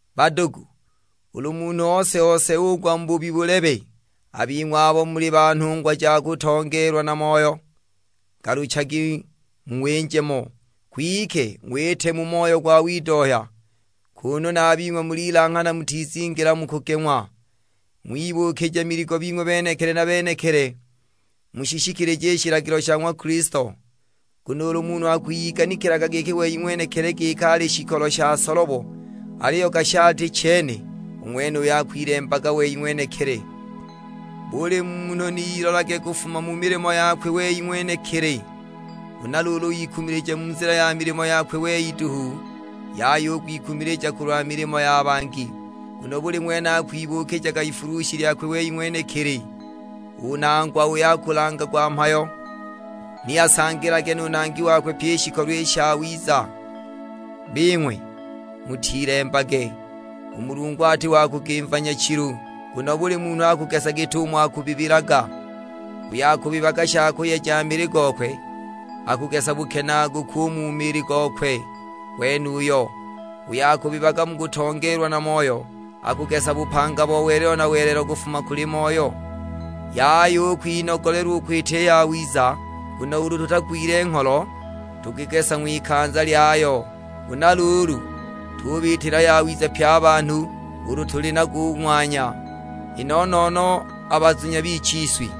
Badugu, ulu munhu ose-ose ugwa mu buhubi bulebe, a bing'we abo muli ba nhungwa ja kutongeelwa na Moyo, ngaluchagi mung'winje mo. Kwike ng'wite mu moyo gwa widohya, kunu na a bing'we mulilanghana mutizingila mu kugeng'wa. Ng'wibuukija miligo bing'we benekili na benekili, mushishikilije i shilagilo sha ng'wa Kilisto. Nguno ulu munhu akwiyiganikilaga wei ng'wenekili giki ali shikolo sha solobo aliyo gashi ati chene, u ng'wenuyo akwilembaga wei ng'wenekili. Buli munhu ni ilolage kufuma mu milimo yakwe wei ng'wenekili, huna ikumilije mu nzila ya milimo yakwe wei duhu; yaya u kwikumilija kulwa milimo ya bangi. Nguno buli ng'wene akwibuukija ifulushi lyakwe wei ng'wenekili! U nangwa uyo akulangagwa mhayo, ni asangilage nu nangi wakwe pyi i shikolo i shawiza. Bing'we, mutilembage; u Mulungu ati wa kugimva nyachilu, nguno buli munhu akugesa git'umo akubibilaga. Uyo akubibaga sha kuyeja mili gokwe, akugesa bukenaaguku u mu mili gokwe gwenuyo. Uyo akubibaga mu kutongeelwa na Moyo, akugesa bupanga bo welelo na welelo kufuma kuli Moyo. Yaya u kwinogolelwa u kwita i yawiza, nguno ulu tutagwile ngholo, tukugesa ng'wikanza lyayo. Huna luulu tubiitila yawiza pye a banhu ulu tuli nago u ng'wanya, i no-no-no a bazunya bichiswi.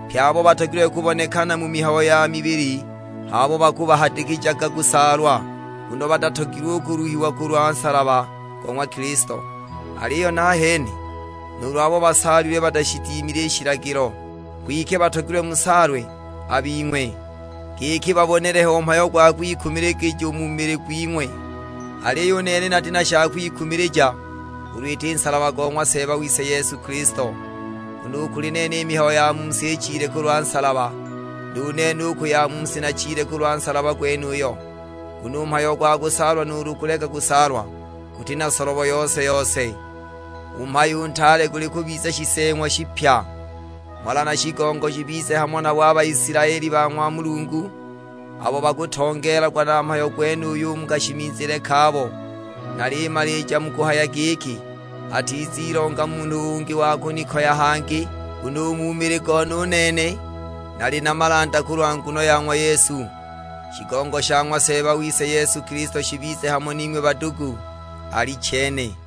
Pye abo batogilwe kubonekana mu mihayo ya mili h'abo bakumuhadikijaga kusaalwa, nguno batatogilwe u kuluhiwa kulwa nsalaba go ng'wa Kilisto. Aliyo nahene, nuulu abo basaalilwe batashidimile i shilagilo; kwike batogilwe musaalwe a bing'we, giki babonele ho mhayo gwa kwikumiligija u mu mili gwing'we. Aliyo u nene nati na sha kwikumiligija, ulu iti nsalaba go ng'wa Seeba wise Yesu Kilisto; nguno u kuli nene i mihayo ya mu si ichile kulwa nsalaba. Nu nene u ku ya mu si nachile kulwa nsalaba gwenuyo. Nguno u mhayo gwa kusaalwa nuulu kuleka kusaalwa guti na solobo yose-yose, u mhayo u ntaale guli kubiza shiseeng'wa shipya. Mhola na shigongo shibize hamo nabo a Baisilaeli ba ng'wa Mulungu, abo bakutongeelagwa na mhayo gwenuyu u mu kashimizile kabo. Nalimalija mu kuhaya giki, atizilonga munhu ungi wa kunikoya hangi, nguno u mu mili gone u nene, nali na malanda kulwa nguno ya ng'wa Yesu. Shigongo sha ng'wa Seeba wise Yesu Kilisto shibize hamo ning'we badugu: Alichene.